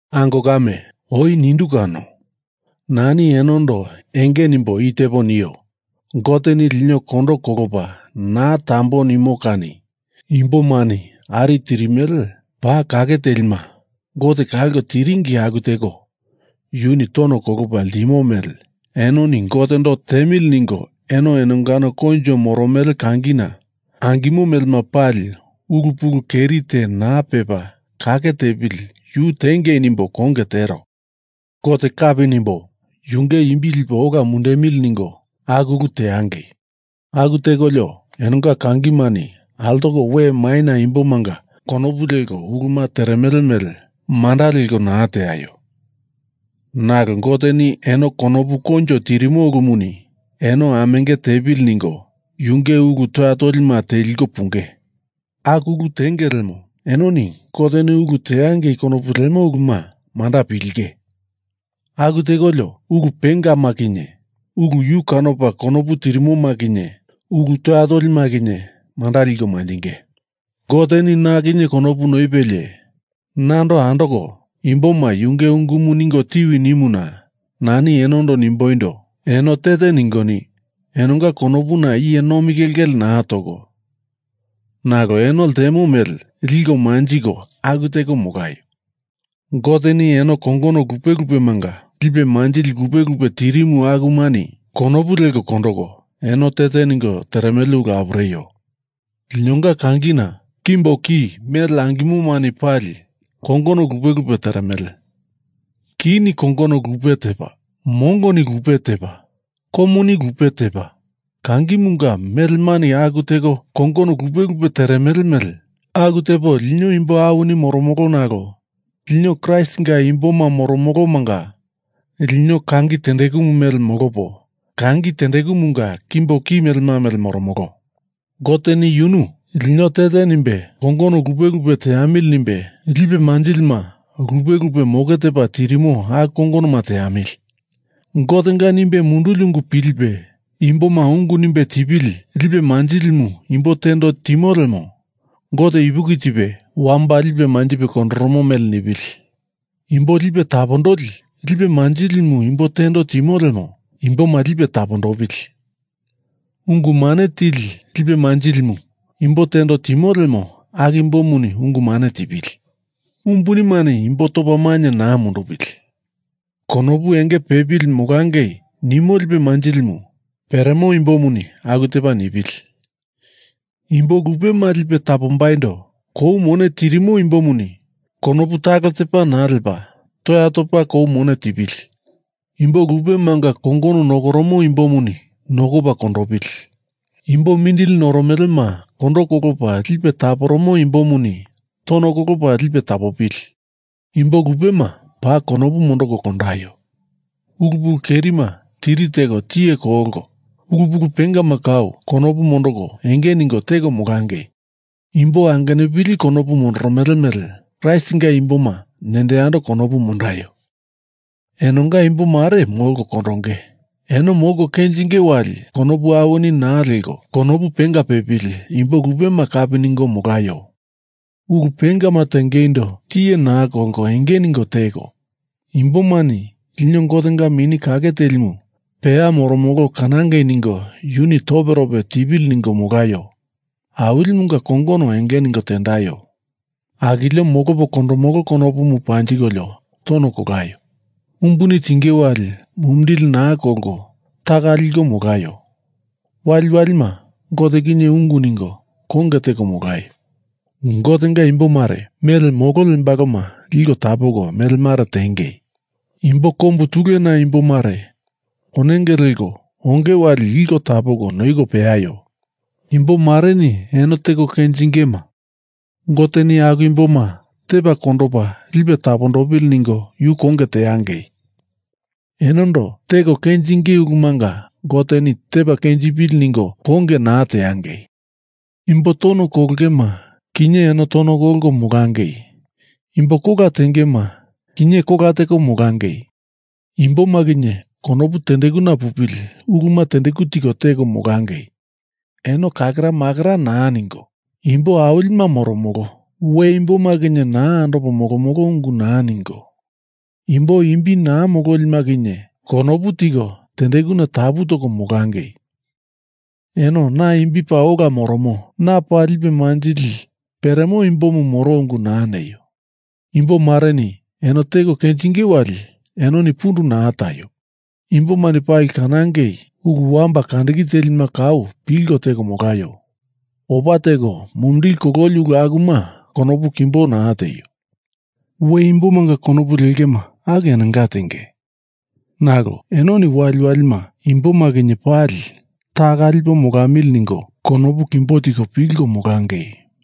Ango kame, oi nindu kano, nani enondo enge nimbo i tepo nio, Goteni lino kondo kolopa naa tambo nimo kani imbomani ari tirimele paa kake telima Gote kalko tiringi aku teko yuni tono kolopa ltimo mele enoni Gotendo tiemili ningo eno enongano koinjo moromele kangina angimo melema pali ulu pulu keri te naa pepa kake tepili yu tiengei nimbo konge tero. Gote kapi nimbo yunge imbi lipo ola mundemili ningo aku ulu teangei. Aku tekolio enonga kangimani altoko we maina imbomanga konopu leko uluma teremele mele manda leko naa teaio. Nalo Goteni eno konopu koinjo tirimo ulumuni eno amenge tepili ningo yunge ulu toya tolima teliko punge. Aku ulu tenge lemo enoni Goteni ulu teangei konopu lemo uluma manda pilinge. Aku tekolio ulu pengama kinye ulu yu kanopa konopu tirimoma kinye ulu toya tolima kinye manda liko manjinge. Goteni na kinye konopu noipelie nando andoko imboma Yunge ungumu ningo tiwi nimuna nani enondo nimboindo: Eno te te ningoni enonga konopuna iye nomi kelkele naa toko nalo eno ltemo mele liko manjiko aku teko molaio. Goteni eno kongono lupe lupemanga lipe manjili lupe lupe tirimu akumani konopu leko kondoko eno te te ningo teremele ulu apureio. Linonga kangina kimbo ki mele angimomani pali kongono lupe lupe teremele. Kini kongono lupe tepa, mongoni lupe tepa, komuni lupe tepa, kangimunga melemani aku teko kongono lupe lupe teremele mele aku tepo lino imbo awini moromolo nalo lino Kraistinga imboma moromolomanga lino kangi tendekumu mele molopo kangi tendekumunga kimbo ki melema mele moromolo. Goteni yunu lino te te nimbo kongono lupe lupe teamili nimbe, lipe manjilima lupe lupe moke tepa tirimo aku kongonoma teamili. Gotenga nimbe munduli ungu pilipe imboma ungu nimbe tipili lipe manjilimu imbo tendo timo lemo Gote ipuki tipe wamba lipe manjipe kondoromo mele nipili. Imbo lipe tapondoli lipe manjilimu imbo tendo timo lemo imboma lipe tapondopili. Ungu mane tili lipe manjilimu imbo tendo timo lemo aku imbomuni ungu mane tipili. Umbunimani imboma topa mainye naa mundupili. Konopu enge pepili molangei nimo lipe manjilimu peremo imbomuni aku tepa nipili. Imbo lupema lipe tapombaindo kou mone tirimo imbomuni konopu talo tepa naa lepa toya topa kou mone tipili. Imbo lupemanga kongono nokoromo imbomuni nokopa kondopili. Imbo mindili noromelema kondo kolopa lipe taporomo imbomuni tono kolopa lipe tapopili. Imbo lupema paa konopu mondoko kondaio. Ulu pulu kerima tiri teko tiye kolko, ulu pulu pengama kau konopu mondoko enge ningo teko molangei. Imbo angenupili konopu mondoromele mele Kraistinga imboma nendo yando konopu mondaio. Enonga imbo mare molko kondonge eno molko kenjinge wali konopu awini naa leko konopu penga pepili imbo lupema kapi ningo molaio. Ulu pengama tengeindo tiye naa kolko enge ningo teko, imbomani lino Gotenga Mini Kake Telimu peya moromolo kanangei ningo yuni toperope tipili ningo molaio. Awilimunga kongono enge ningo tendaio. Akilio molopo kondomolo konopumu panjikolio tono kolaio. Umbuni tinge wali mumindili naa kolko taka liko molaio. Waliwalima Gote kinye ungu ningo konge teko molaio. Gotenga imbo mare mele molo lembaloma liko tapoko mele mare tiengei. Imbo kombu tulena imbo mare ponenge leko onge wali liko tapoko noiko peaio. Imbo mareni eno teko kenjingema Goteni aku imboma tepa kondopa lipe tapondopili ningo yu konge teangei. Enondo teko kenjinge ulumanga Goteni tepa kenjipili ningo konge naa teangei. Imbo tono kolongema kinye eno tono kolko molangei. Imbo kola tengema kinye kola teko molangei. Imboma kinye konopu tendekuna pupili uluma tendeku tiko teko molangei. Eno kakeramakera naa ningo imbo awilima moromolo, we imboma kinye naa andopo molomolo ungu naa ningo, imbo imbi naa mololima kinye konopu tiko tendekuna tapu toko molangei. Eno na imbi paa ola moromo, na paa lipe manjili peremo imbomu moro ungu naa neio. Imbo mareni eno teko kenjinge wali enoni pundu naa taio! Imbomani pali kanangei ulu wamba kandiki telima kau pilko teko molaio. Opa teko mumindili kololi ulu akuma konopu kimbo naa tieio. We imbomanga konopu lengema aku enonga tenge. Nalo enoni waliwalima imboma kinye pali taka lipo molamili ningo konopu kimbo tiko pilko molangei.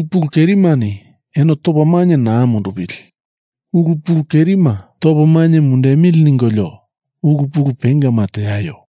Ulu pulu kerimani eno tepa maindo naa mundupili. Ulu pulu kerima topo mainye mundemili ningolio ulu pulu pengama teaio.